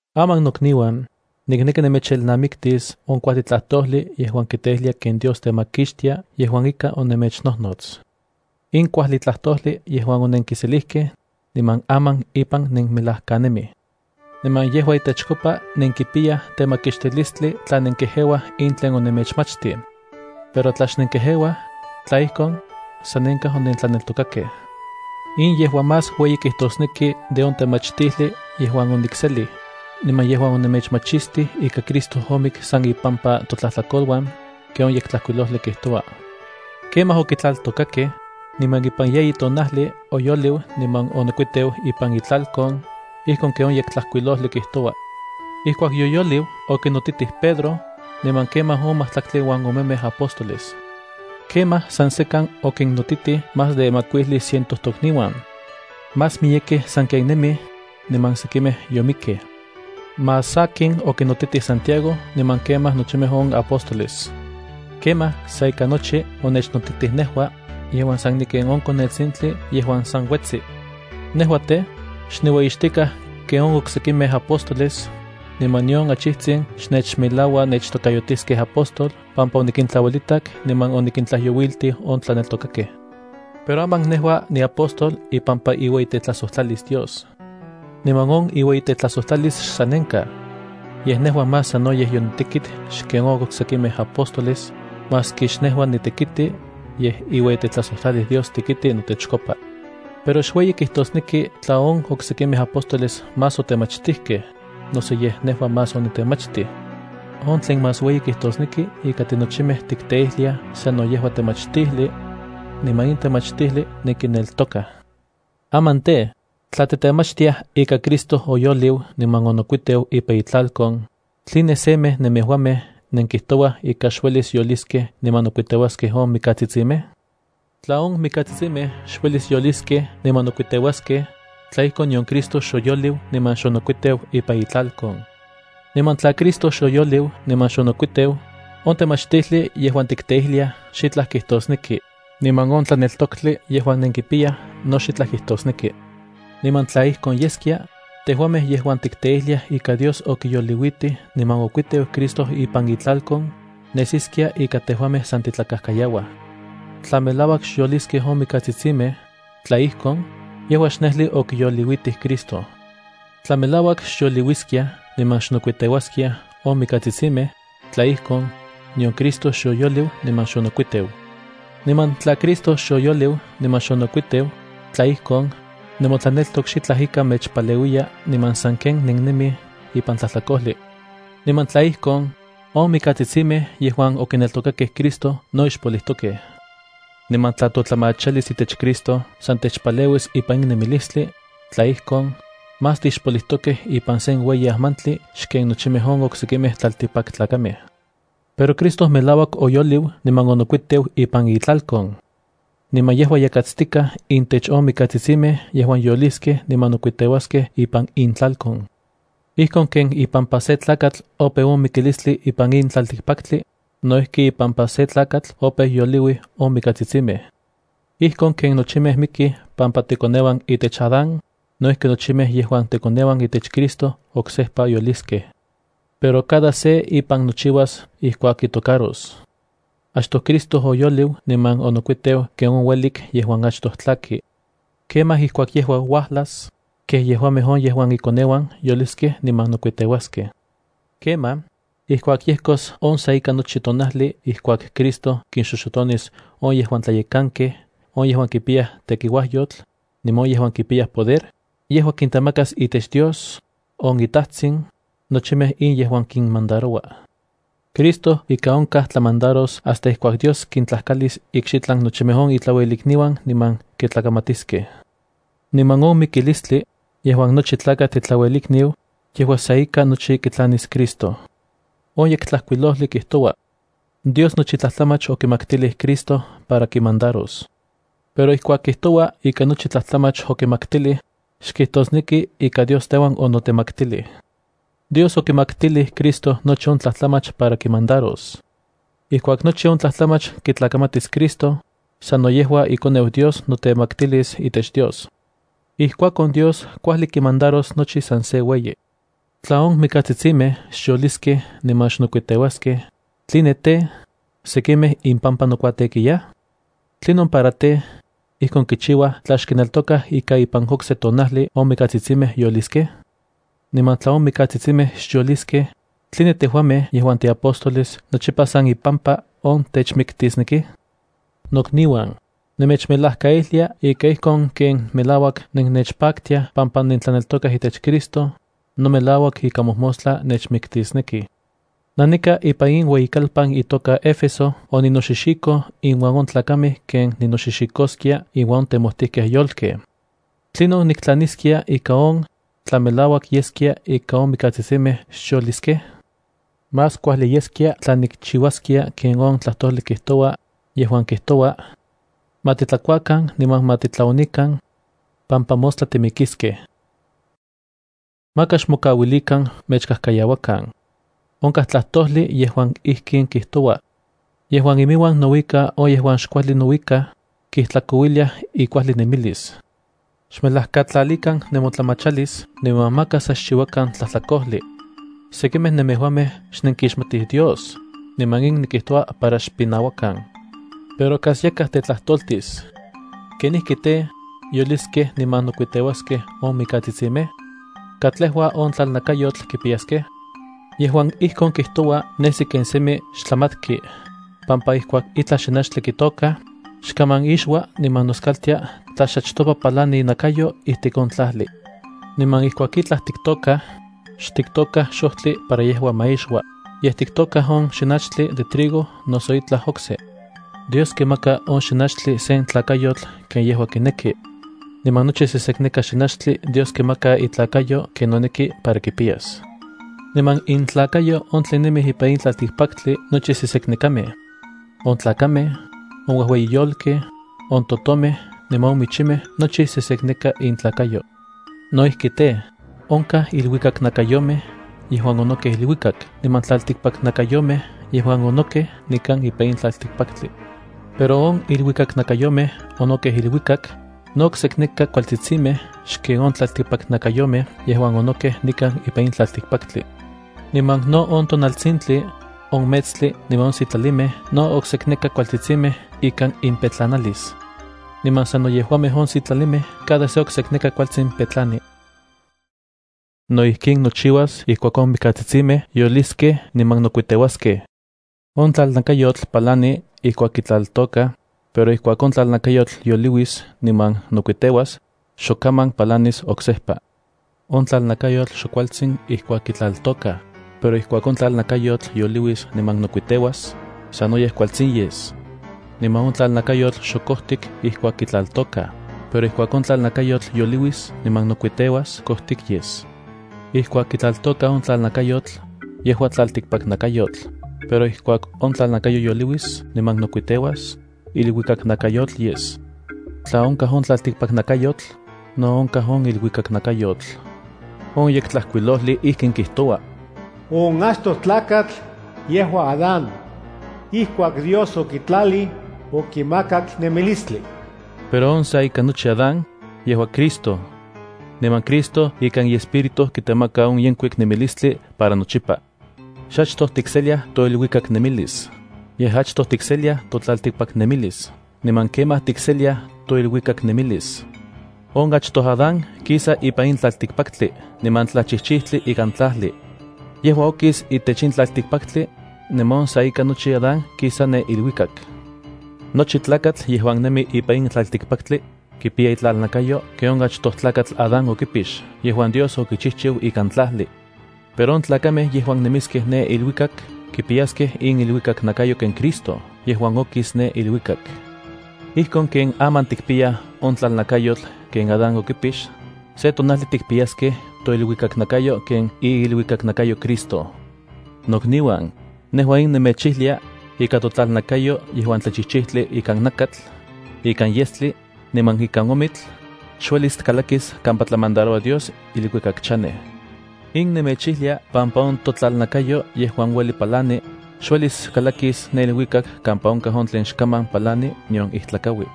Aman nokniuan, nikneki nemechelnamiktis on kuajli tlajtojli yejuan kiteijlia ken Dios temakixtia yejuan ika onemechnojnots. In kuajli tlajtojli yejuan onenkiselijkej, niman aman ipan nenmelajkanemij. Niman yejua itechkopa nenkipiyaj temakixtilistli tla nenkejeuaj in tlen onemechmachtij. Pero tla xnenkejeuaj, tla ijkon, sanenkaj onentlaneltokakej. In yejua más ueyi kijtosneki de on temachtijli yejuan onikselij, niman yejuan onemechmachistij ika Cristo omik san ipampa totlajtlakoluan, ken on Yektlajkuilojli kijtoua. Kemaj okitlaltokakej, niman ipan yeyi tonajli oyoliu niman onokuiteu ipan itlalkon, ijkon ken on Yektlajkuilojli kijtoua. Ijkuak yoyoliu, okinotitij Pedro, niman kemaj on majtlaktli uan omemej apóstoles. Kemaj san sekan okinnotitij más de makuijli ciento tokniuan. Más miyekej sanken nemij, maski sekimej yomikkej. Más sakin okinotitij Santiago niman kemaj nochimej on apóstoles. Kemaj sa ika nochi onechnotitij nejua, yejuan sa niken on konetsintli yejuan san uetsi. Nejua tej, xniueyixtikaj ken on oksekimej apóstoles, niman nion achijtsin xnechmelaua nechtokayotiskej apóstol pampa onikintlauelitak niman onikintlajyouiltij on tlaneltokakej. Pero aman nejua niapóstol ipampa iueyitetlajsojtlalis Dios. Niman on iueyitetlajsojtlalis xsanenkaj. Yej nejua más sanoyej yonitekit xken on oksekimej apóstoles, maski xnejua nitekiti, yej iueyitetlajsojtlalis Dios tekiti notechkopa. Pero xueyi kijtosneki tla on oksekimej apóstoles más otemachtijkej, noso yej nejua más onitemachitij. On tlen más ueyi kijtosneki ika tinochimej tikteijliaj sano yejua temachtijli, niman in temachtijli nenkineltokaj. Aman tej, tla titemachtiaj ika Cristo oyoliu niman onokuiteu ipan itlalkon, ¿tline semej nemejuamej nenkijtouaj ika xuelis yoliskej niman nokuiteuaskej on mikatsitsimej? Tla on mikatsitsimej xuelis yoliskej niman nokuiteuaskej, tla ijkon nion Cristo xoyoliu niman xonoketsteu ipan itlalkon. Niman tla Cristo xoyoliu niman xonokuiteu, on temachtijli yejuan tikteijliaj xitlaj kijtosneki, niman on tlaneltoktli yejuan nenkipiyaj no xitlaj kijtosneki. Niman tla ijkon yeskia, tejuamej yejuan tikteijliaj ika Dios okiyoliuitij niman okuiteu Cristo ipan itlalkon, nesiskia ika tejuamej san titlakajkayauaj. Tla melauak xyoliskej on mikatsitsimej, tla ijkon, yejua xnejli okiyoliuitij Cristo. Tla melauak xyoliuiskiaj niman xnokuiteuaskiaj on mikatsitsimej, tla ijkon, nion Cristo xoyoliu niman xonokuiteu. Niman tla Cristo xoyoliu niman xonokuiteu, tla ijkon, nemotlaneltok xitlaj ika mechpaleuiya niman sanken nennemij ipan tlajtlakojli. Niman tla ijkon, on mikatsitsimej yejuan okineltokakej Cristo no ixpolijtokej. Niman tla totlamachalis itech Cristo san techpaleuis ipan in nemilistli, tla ijkon, más tixpolijtokej ipan sen ueyi ajmantli xken nochimej on oksekimej tlaltikpaktlakamej. Pero Cristo melauak oyoliu niman onokuiteu ipan itlalkon. Niman yejua yakatstikaj intech on mikatsitsimej yejuan yoliskej niman nokuiteuaskej ipan intlalkon. Ijkon ken ipampa sen tlakatl opeu on mikilistli ipan in tlaltikpaktli, no ijki ipampa sen tlakatl opeu yoliuij on mikatsitsimej. Ijkon ken nochimej mikij pampa tekoneuan itech Adán, no ijki nochimej yejuan tekoneuan itech Cristo oksejpa yoliskej. Pero cada se ipan nochiuas ijkuak kitocaros. Achtoj Cristo oyoliu niman onokuiteu ken on uelik yejuan achtoj tlaki. Kemaj ijkuak yejua uajlas, kej yejuamej on yejuan ikoneuan yoliskej niman nokuiteuaskej. Kemaj, ijkuak yejkos on sa ika nochi tonajli ijkuak Cristo kinxoxotonis on yejuan tlayekankej, on yejuan kipiyaj tekiuajyotl, niman on yejuan kipiyaj poder, yejua kintemakas itech Dios on iTajtsin nochimej in yejuan kinmandaroua. Cristo ika onkaj tlamandaros hasta ijkuak Dios kintlajkalis ikxitlan nochimej on itlauelikniuan niman kitlakamatiskej. Niman on mikilistli, yejuan nochi tlaktl itlauelikniu, yejua sa ika nochi kitlanis Cristo. On Yektlajkuilojli kijtoua: “Dios nochi tlajtlamach okimaktilij Cristo para kimandaros.” Pero ijkuak kijtoua ika nochi tlajtlamach okimaktilij, xkijtosneki ika Dios teuan onotemaktilij. Dios okimaktilij Cristo nochi on tlajtlamach para kimandaros. Ijkuak nochi on tlajtlamach kitlakamatis Cristo, sano yejua iKoneu Dios notemaktilis itech Dios. Ijkuakon Dios kuajli kimandaros nochi san se ueyi. Tla on mikatsitsimej xyoliskej niman xnokuiteuaskej, ¿tline tej, sekimej impampa nokuatekiyaj? ¿Tlinon para tej, ijkon kichiuaj tla xkineltokaj ika ipan okse tonajli on mikatsitsimej yoliskej? Niman tla on mikatsitsimej xyoliskej, ¿tline tejuamej yejuan tiapóstoles nochipa san ipampa on techmiktisnekij? Nokniuan, nemechmelajkaijlia ika ijkon ken melauak nennechpaktiaj pampa nentlaneltokaj itech Cristo, no melauak ika mojmostla nechmiktisnekij. Nanika ipan in ueyikalpan itoka Éfeso oninoxixikoj inuan on tlakamej ken ninoxixikoskia inuan on temojtijkej yolkej. ¿Tlinon niktlaniskia ika on, tla melauak yeskia ika on mikatsitsimej xyoliskej? Más kuajli yeskia tla nikchiuaskia ken on tlajtojli kijtoua, yejuan kijtoua: “Ma titlakuakan niman ma titlaonikan, pampa mostla timikiskej.” Maka xmokauilikan mechkajkayauakan. Onkaj tlajtojli yejuan ijkin kijtoua: “Yejuan iminuan nouika on yejuan xkuajli nouikaj, kijtlakouiliaj ikuajli nemilis.” Xmelajkatlalikan nemotlamachilis niman maka sa xchiuakan tlajtlakojli. Sekimej nemejuamej xnenkixmatij Dios, niman in nikijtoua para xpinauakan. Pero kas yakaj tetlajtoltis: “¿Kenijki tej, yoliskej niman nokuiteuaskej on mikatsitsimej? ¿Katlejua on tlalnakayotl kipiyaskej?” Yejuan ijkon kijtoua nesi ken semi xtlamatki, pampa ijkuak itlaj xinachtli kitôkaj, xkaman ixua niman noskaltia tla xachtopa palani inakayo ijtik on tlajli. Niman ijkuak itlaj tiktôkaj, xtiktôkaj xojtli para yejua ma ixua, yej tiktôkaj on xinachtli de trigo noso itlaj okse. Dios kimaka on xinachtli sen tlakayotl ken yejua kineki. Niman nochi sesekneka xinachtli Dios kimaka itlakayo ken noneki para kipiyas. Niman intlakayo on tlen nemij ipan in tlaltikpaktli nochi seseknekamej. On tlakamej, on uejueyi yolkej, on totomej niman on michimej nochi sesekneka intlakayo. No ijki tej, onkaj iluikaknakayomej yejuan onokej iluikak niman tlaltikpaknakayomej yejuan onokej nikan ipan in tlaltikpaktli. Pero on iluikaknakayomej onokej iluikak, no oksekneka kualtsitsimej xken on tlaltikpaknakayomej yejuan onokej nikan ipan in tlaltikpaktli. Niman no on tonaltsintli, on metstli niman on sitlalimej no oksekneka kualtsitsimej ikan impetlanalis. Niman sano yejuamej on sitlalimej cada se oksekneka kualtsin petlani. No ijkin nochiuas ijkuak on mikatsitsimej yoliskej niman nokuiteuaskej. On tlalnakayotl palani ijkuak kitlaltôkaj, pero ijkuak on tlalnakayotl yoliuis niman nokuiteuas, xok kaman palanis oksejpa. On tlalnakayotl xok kualtsin ijkuak kitlaltôkaj, pero ijkuak on tlalnakayotl yoliuis niman nokkiteuas, sanoyej kualtsin yes. Niman on tlalnakayotl xok kojtik ijkuak kitlaltôkaj, pero ijkuak on tlalnakayotl yoliuis niman nokuiteuas kojtik yes. Ijkuak kitlaltôkaj on tlalnakayotl, yejua tlaltikpaknakayotl, pero ijkuak on tlalnakayotl yoliuis niman nokuiteuas, iluikaknakayotl yes. Tla onkaj on tlaltikpaknakayotl, no onkaj on iluikaknakayotl. On Yektlajkuilojli ijkin kijtoua: “On achtoj tlakatl, yejua Adán. Ijkuak Dios okitlalij, okimakak nemilistli.” Pero on sa ika nochi Adán, yejua Cristo. Niman Cristo ikan iEspíritu kitemaka on yenkuik nemilistli para nochipa. Xachtoj tikseliaj toiluikaknemilis, yej achtoj tikseliaj totlaltikpaknemilis niman kemaj tikseliaj toiluikaknemilis. On achtoj Adán kisa ipan in tlaltikpaktli niman tlachijchijtli ikan tlajli. Yejua okis itech in tlaltikpaktli, niman on sa ika nochi Adán kisa ne iluikak. Nochi tlakatl yejuan nemi ipan in tlaltikpaktli, kipiya itlalnakayo ken on achtoj tlakatl Adán okipix yejuan Dios okichijchiu ikan tlajli. Pero on tlakamej yejuan nemiskej ne iluikak kipiyaskej iniluikaknakayo ken Cristo yejuan okis ne iluikak. Ijkon ken aman tikpiyaj on tlalnakayotl ken Adán okipix, se tonajli tikpiyaskej toiluikaknakayo ken iiluikaknakayo Cristo. Nokniuan nejua in nemechijlia, ika totlalnakayo yejuan tlachijchijtli ikan nakatl, ikan yestli, niman ikan omitl, xuelis kalakis kampa tlamandaroua Dios iluikak chanej. In nemechijlia pampa on totlalnakayo yejuan ueli palani xuelis kalakis ne iluikak kampa onkaj on tlen xkaman palani nion ijtlakaui.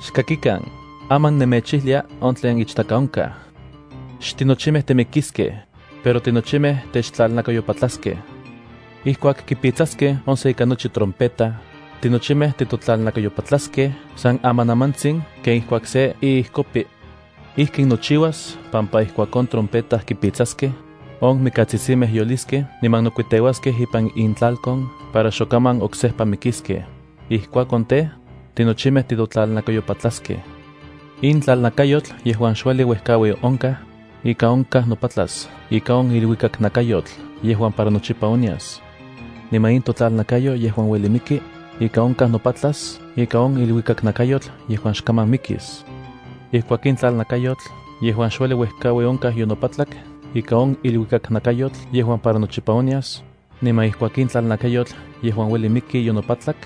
Xkakikan, aman nemechijlia on tlen ichtaka onkaj. Xtinochimej timikiskej, pero tinochimej techtlalnakayopatlaskej. Ijkuak kipitsaskej on sa ika nochi trompeta, tinochimej titotlalnakayopatlaskej san amanamantsin ken ijkuak se iijkopi. Ijkin nochiuas pampa ijkuak on trompeta kipitsaskej, on mikatsitsimej yoliskej niman nokuiteuaskej ipan intlalkon para xokaman oksejpa mikiskej. Ijkuakon tej, tinochimej titotlalnakayopatlaskej. In tlalnakayotl yejuan xueli uejkaui onkaj, ika onkaj nopatlas ika on iluikaknakayotl yejuan para nochipa onyas. Niman in totlalnakayo yejuan ueli miki, ika onkaj nopatlas ika on iluikaknakayotl yejuan xkaman mikis. Ijkuak in tlalnakayotl yejuan xueli uejkaui onkaj yonopatlak ika on iluikaknakayotl yejuan para nochipa onyas, niman ijkuak in tlalnakayotl yejuan ueli miki yonopatlak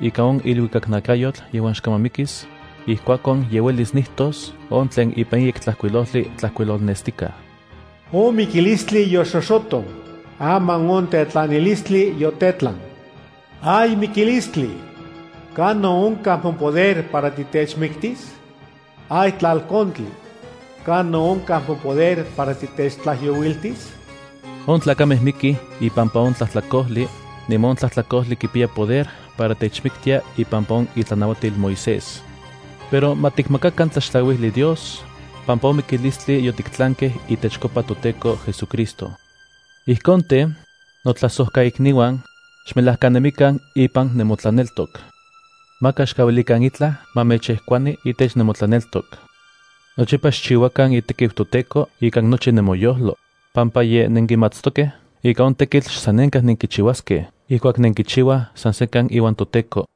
ika on iluikaknakayotl yejuan xkaman mikis, ijkuakon ye uelis nijtos on tlen ipan in Yektlajkuilojli tlajkuilolnestikaj: “On mikilistli yoxoxoton, aman on tetlanilistli yotetlan. ¡Ay mikilistli! ¿Kanon onkaj mopoder para titechmiktis? ¡Ay tlalkontli! ¿Kanon onkaj mopoder para titechtlajyouiltis?” On tlakamej mikij ipampa on tlajtlakojli, niman on tlajtlakojli kipiya poder para techmiktia ipampa on itlanauatil Moisés. Pero ma tikmakakan tlaxtlauijli Dios, pampa on mikilistli yotiktlankej itechkopa toTEKO JesuCristo. Ijkon tej, notlajsojkaikniuan, xmelajkanemikan ipan nemotlaneltok. Maka xkauilikan itlaj ma mechejkuani itech nemotlaneltok. Nochipa xchiuakan itekiu toTEKO ikan nochi nemoyojlo, pampa ye nenkimatstokej ika on tekitl xsanenkaj nenkichiuaskej ijkuak nenkichiuaj san sekan iuan toTEKO.